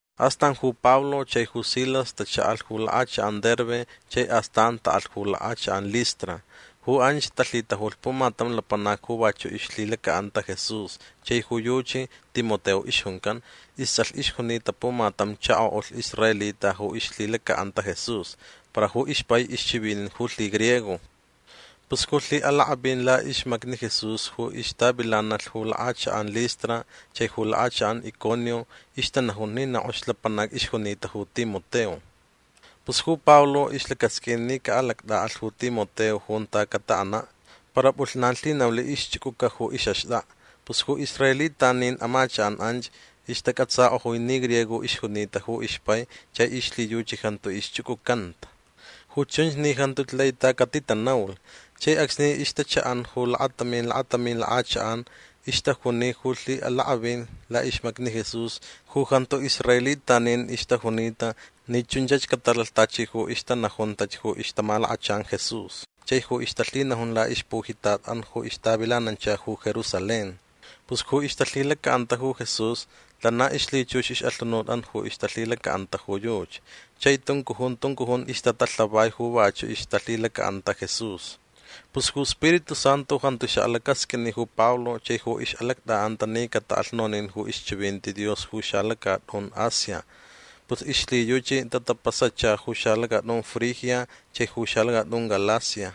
Astan ju Pablo chai ju Silas tacha'alh ju lak'achak'an Derbe chai astan ta'alh ju lak'achak'an Listra. Ju anch talhitajulh pumatam lapanac ju vachu' ixlhilaca'anta Jesús chai ju yuchi Timoteo ixjuncan. Ists'alh ixjunita pumatam chako'ulh israelita ju ixlhilaca'anta ju Jesús. Para ju ixpai ixchivinin ju lhigriego. Pus ju lhi'alak'avin la'ixmacni Jesús ju ixtavilanalh ju lak'achak'an Listra chai ju lak'achak'an Iconio ixtanajun ni na k'ox lapanac ixjunita ju Timoteo. Pus ju Pablo ixlacasq'uin ni ca'alact'a'alh ju Timoteo junta cata'ana'. Para p'ulhnan lhinaulh ixch'uc'uca ju ix'axt'ak'a. Pus ju israelitanin amachak'an anch ixtac'atsak'ojui ni griego ixjunita ju ixpai chai ixlhiyuchi jantu ixch'uc'ucanta. Ju chunch ni jantuch lai ta catitanaulh. Chai acsni ixtacha'an ju lakatamin lakatamin lak'achak'an ixtajuni ju lhi'alak'avin la'ixmacni Jesús ju jantu israelitanin ixtajunita ni chunch catalalh tachi ju ixtanajuntach ju ixtamalakachan Jesús chai ju ixtalhinajun la'ixpujitat'an ju ixtavilanancha ju Jerusalén. Pus ju ixtalhilaca'anta ju Jesús lana ixlhichux ix'alhunut ju ixtalhilaca'anta ju yuchi. Chai tuncujun tuncujun ixtatalhavai ju vachu' ixtalhilaca'anta Jesús. Pus ju Spiritu Santu jantu xa'alacasq'uini ju Pablo chai ju ix'alact'a'anta ni cata'alh nonin ju ixchivinti Dios ju xalacat'un Asia. Pus ixlhiyuchi tatapasacha ju xalacat'un Frigia chai ju xalacat'un Galacia.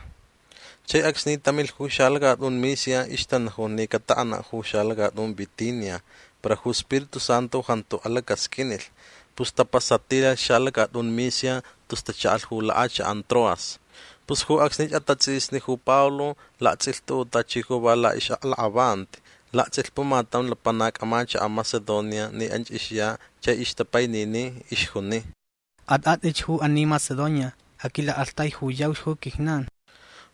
Chai acsni tamilh ju xalacat'un Misia ixtanajun ni cata'ana' ju xalacat'un Bitinia. Para ju Spiritu Santu jantu alacasq'uinilh. Pus tapasatilalh laxalacat'un Misia tus tacha'alh ju lak'achak'an Troas. Pus ju acsnich atats'isni ju Pablo lakts'ilh tu'u' tachi ju va la'ix'aklak'avanti. Lakts'ilh pumatam lapanac amachaka' Macedonia ni anch ixya chai ixtapainini. Ixjuni: “At'at'ich ju ani Macedonia. Aquila'aktaijuyauch ju quijnan”.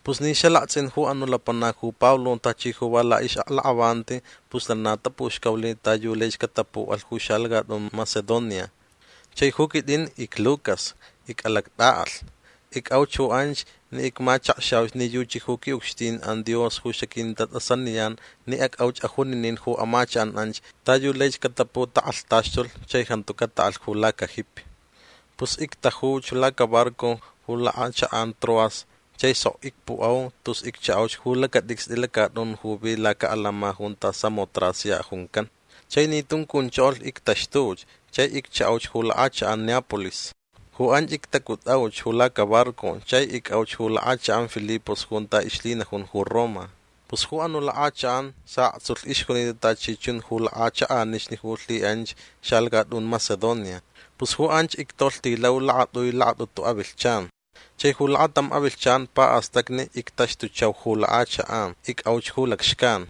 Pus ni xalakts'in ju anu' lapanac ju Pablo tachi ju va la'ix'aklak'avanti pus lana tapuxcaulh ta yu laich catapu'alh ju xalacat'un Macedonia. Chai ju quit'in icLucas. Ic'alact'a'alh. Ic'auch ju anch ni icmachakxauch ni yuchi ju qui'ucxtin'an Dios ju xaquintat'asaniyan ni ac'auch ajuninin ju amachak'an anch ta yu laich cataputak'alhtaxtulh chai jantu cata'alh ju lacajipi. Pus ictajutauch lacabarco ju lak'achak'an Troas chai sok icpu'au tus iccha'auch ju lacat'icst'i lacat'un ju vi laca'alama junta Samotracia juncan. Chai ni tuncunchokolh ictaxtuch chai iccha'auch ju lak'achak'an Neápolis. Ju anch ictacut'auch ju lacabarco chai ic'auch ju lak'achak'an Filipos junta ixlhinajun ju Roma. Pus ju anu' lak'achak'an sa'aktsulh ixjunita tachi chun ju lak'achak'anixni ju lhi'anch xalacat'un Macedonia. Pus ju anch ictolhtilau lakat'ui lakat'utu avilhchan. Chai ju lakatam avilhchan pa'astacni ictaxtuchau ju lak'achak'an. Ic'auch ju lacxcan.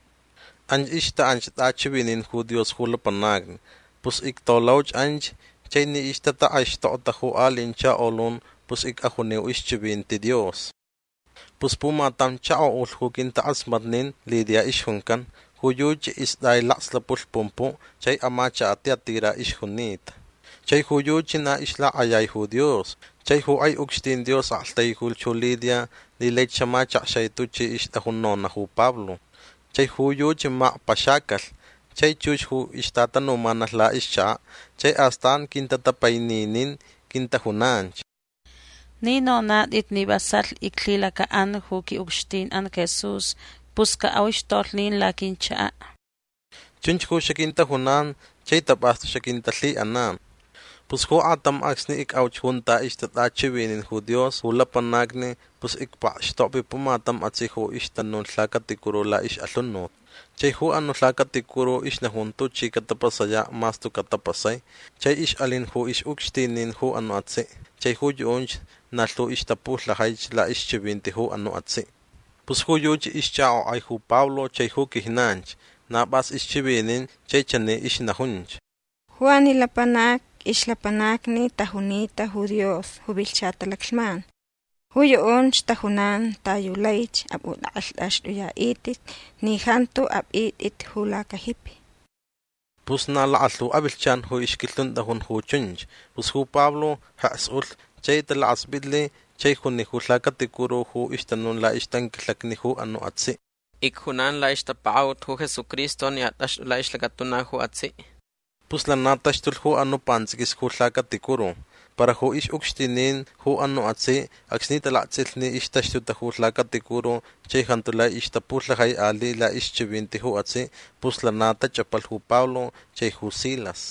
Anch ixta'anch t'achivinin ju Dios ju lapanacni. Pus ictolauch anch chai ni ixtatak'aixtokta ju ali'in chakolun pus ic'ajuniu ixchivinti Dios. Pus pumatam chako'ulh ju quintak'asmatnin Lidia ixjuncan. Ju yuchi ist'ai lakslapulh pumpu' chai amachaka' Tiatira ixjunita. Chai ju yuchi na ixlak'ayai ju Dios. Chai ju k'ai ucxtin Dios aktaijulh ju Lidia ni laich xamachakxai tuchi ixt'ajun nona' ju Pablo. Chai ju yuchi makpaxacalh chai chux ju ixtatanumanalh la'ixchaka'. Chai astan quintatapaininin. Quintajunanch: ―Ni nonat'it ni vasalh iclhilaca'an ju qui'ucxtin'an Jesús pus ca'auch tolhnin laquinchaka'. Chunch ju xaquintajunan chai tap'astu xaquintalhi'anan. Pus ju aktam acsni ic'auch junta ixtat'achivinin ju Dios ju lapanacni pus icpakxtokvi pumatam atsi' ju ixtanun ju lhacaticuru la'ix'alhunut. Chai ju anu' lhacaticuru ixnajun tuchi catapasaya' mas tuca' tapasai. Chai ix'alin ju ix'ucxtinin ju anu' atsi' chai ju yu'unch na lhu ixtapulhajaich la'ixchivinti ju anu' atsi'. Pus ju yuchi ixch'ak'ok'ai ju Pablo chai ju quijnanch. Na p'as ixchivinin chai chani ixnajunch: ―Ju ani lapanacni ixlapanacni tajunita ju Dios ju vilhcha talaclhman. Ju yu'unch tajunan ta yu laich ap'ut'ak'alht'axt'uya'it'it ni jantu ap'it'it ju lacajipi. Pus na lakalhu avilhchan ju ixquilhunt'ajun ju chunch. Pus ju Pablo jeks ulh chai talakasp'itlh chai juni ju lhacaticuru ju ixtanun la'ixtanquilhacni ju anu' atsi': ―Icjunan la'ixtapaka'ut ju Jesucristo ni at'axt'u la'ixlacatuna ju atsi'. Pus lana taxtulh ju anu' pants'iquis ju lhacaticuru. Para ju ix'ucxtinin ju anu' atsi' acsni talakts'ilh ni ixtaxtuta ju lhacaticuru chai jantu lai ixtapulhajai ali' la'ixchivinti ju atsi' pus lana tach'apalh ju Pablo chai ju Silas.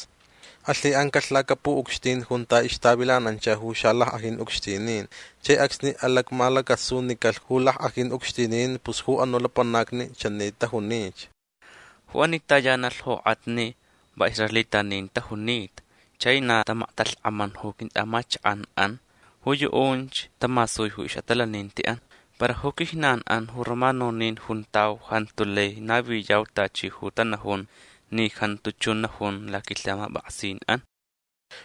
Alhi'ancalh lacapu'ucxtin junta ixtavilanancha ju xalack'ajin ucxtinin. Chai acsni alacmalacasunicalh ju lack'ajin ucxtinin pus ju anu' lapanacni chani tajunich: ―Ju ani tayanalh jok'atni va israelitanin tajunita chai na tamaktalhk'aman ju quint'a'amachak'an'an. Ju yu'unch tamasui ju ix'atalaninti'an. Para ju quijnan'an ju romanonin juntau jantu lai naviyau tachi ju tanajun ni jantu chun najun laquilhamap'aksin'an.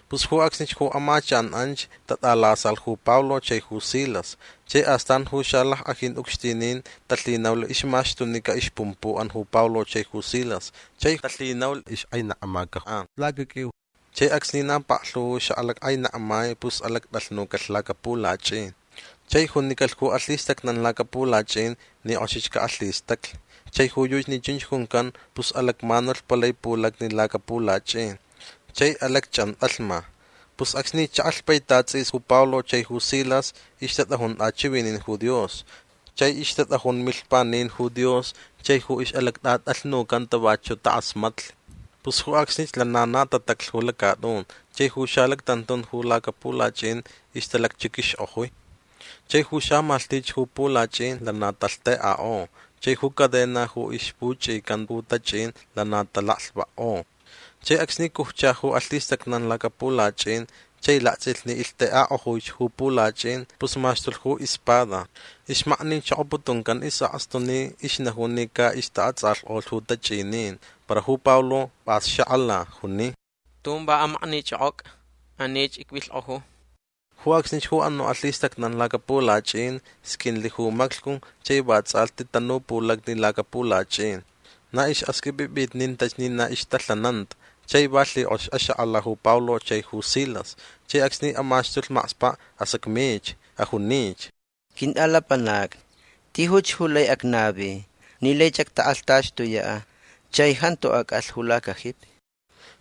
Pus ju acsnich ju amachak'an anch tat'alasalh ju Pablo chai ju Silas. Chai astan ju xalack'ajin ucxtinin talhinaulh ixmaxtunica ixpumpu'an ju Pablo chai ju Silas chai talhinaulh ix'ak'ainekmaca'an lacaq'uiu. Chai acsni na paklhu ju xa'alack'ainekmai pus alact'alhnucalh lacapulach'in. Chai junicalh ju alhistacnan lacapulach'in ni k'oxich ca'alhistaclh. Chai ju yuchi ni chunch juncan pus alacmanulh palai pulacni lacapulach'in. Chai alacch'ant'alhma. Pus acsni cha'alh paitat ts'is ju Pablo chai ju Silas ixtat'ajun t'achivinin ju Dios chai ixtat'ajun milhpanin ju Dios chai ju ix'alact'at'alhnucanta vachu' tak'asmatnilh. Pus ju acsnich lana na tataclh ju lacat'un chai ju xalactantun ju lacapulach'in ixtalacchiq'uixk'ojui. Chai ju xamalhtich ju pulach'in lana talhtek'ak'o. Chai ju cadena ju ixpuch'ican ju tach'in lana talaklhvakk'o. Chai acsni cujcha ju alhistacnan lacapulach'in chai lakts'ilh ni ilhtek'ak'ojuich ju pulach'in pus maxtulh ju ispada. Ixmaknichokoputuncan is'akstu ni ixnajun ni ca'ixta'ats'alhk'olhch ju tach'inin. Para ju Pablo p'as xak'ala. Juni: ―Tun va amaknich'ok'oc'a. Anich icvilhk'oju. Ju acsnich ju anu' alhistacnan lacapulach'in sq'uinlh ju maclhcu chai vats'alhti tanu pulacni lacapulach'in. Na ix'axq'uip'ip'itnintach ni na ixtalhananta. Chai va lhik'ox axak'ala ju Pablo chai ju Silas. Chai acsni amaxtulh makspa' asacmich. Ajunich: ―Quint'alapanacni tijuch ju lai acnavi ni laich actak'alhtaxtuya' chai jantu ac'alh ju lacajipi.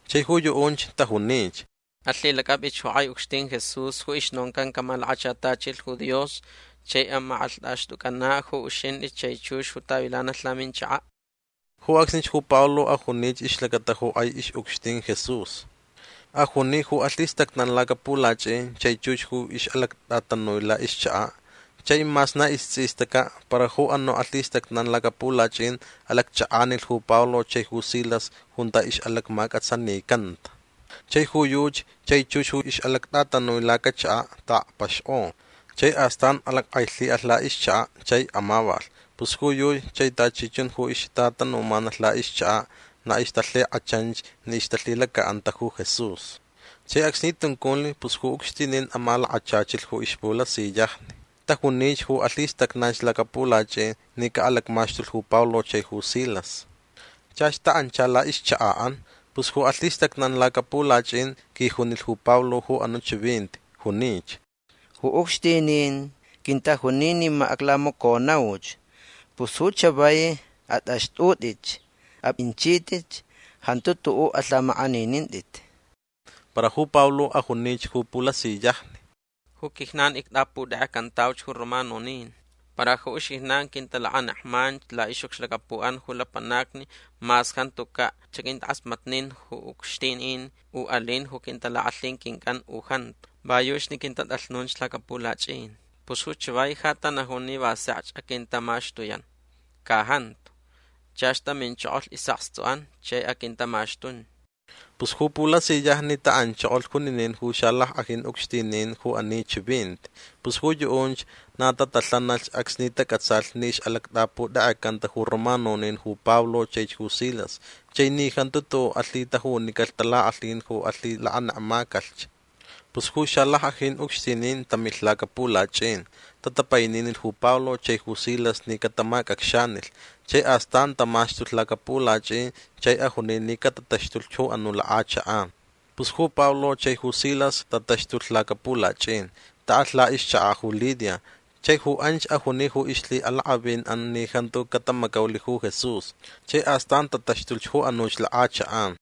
Chai ju yu'unch tajunich: ―Alhilac'ap'ich ju k'ai ucxtin Jesús ju ixnoncan camalakachatachilh ju Dios chai amak'alht'axt'uc'ana' ju uxint'i chai chux ju tavilanalh laminchaka'. Ju acsnich ju Pablo ajunich ixlacata ju k'ai ix'ucxtin Jesús. Ajuni ju alhistacnan lacapulach'in chai chux ju ix'alact'atanui la'ixchaka'. Chai mas na ists'istaca' para ju anu' alhistacnan lacapulach'in alacch'ak'anilh ju Pablo chai ju Silas junta ixlacmac'atsanicanta. Chai ju yuchi chai chux ju ix'alact'atanui lacachaka' ta'akpaxk'o. Chai astan alack'ailhi'alh la'ixchaka' chai amavalh. Pus ju yuchi chai tachi chun ju ixtatanumanalh la'ixchaka' na ixtalhik'achanch ni ixtalhilaca'anta ju Jesús. Chai acsni tunculh pus ju ucxtinin amalakachachilh ju ixpulasiyajni. Tajunich ju alhistacnanch lacapulach'in ni ca'alacmaxtulh ju Pablo chai ju Silas. Chach ta'ancha la'ixchaka'an. Pus ju alhistacnan lacapulach'in quijunilh ju Pablo ju anu' chivinti. Junich: ―Ju ucxtinin quintajuni ni ma aclamaconauch. Pus ju chavai at'axt'ut'itch. A'inchit'itch. Jantu tu'u' alhamak'aninint'it. Para ju Pablo ajunich ju pulasiyajni: ―Ju quijnan ict'aputek'ecantauch ju romanonin. Para ju uxijnan quintalakanekmanch la'ix'ucxlacapu'an ju lapanacni mas jantuca' xaquintak'asmatnin ju ucxtinin u alin ju quintalak'alhin quinc'an u jantu. Va yuchi ni quintat'alhnunch lacapulach'in. Pus ju chavai ja tanajun ni va sekch aquintamaxtuyan. Ca jantu. Chach taminchokolh is'akstu'an chai aquintamaxtun. Pus ju pulasiyajni ta'anchokolh juninin ju xalack'ajin ucxtinin ju ani chivinti. Pus ju yu'unch na tatalhanalhch acsni tac'atsalh ni ix'alact'aputek'ecanta ju romanonin ju Pablo chaich ju Silas chai ni jantu tu'u' alhitajunicalh talak'alhin ju alhilakanekmacalh. Pus ju xalack'ajin ucxtinin tamilh lacapulach'in. Tatapaininilh ju Pablo chai ju Silas ni catamac'acxanilh. Chai astan tamaxtulh lacapulach'in chai ajuni ni catataxtulh ju anuch lak'achak'an. Pus ju Pablo chai ju Silas tataxtulh lacapulach'in. Ta'alh la'ixchaka' ju Lidia. Chai ju anch ajuni ju ixlhi'alak'avin'an ni jantu catamacaulh ju Jesús. Chai astan tataxtulh ju anuch lak'achak'an.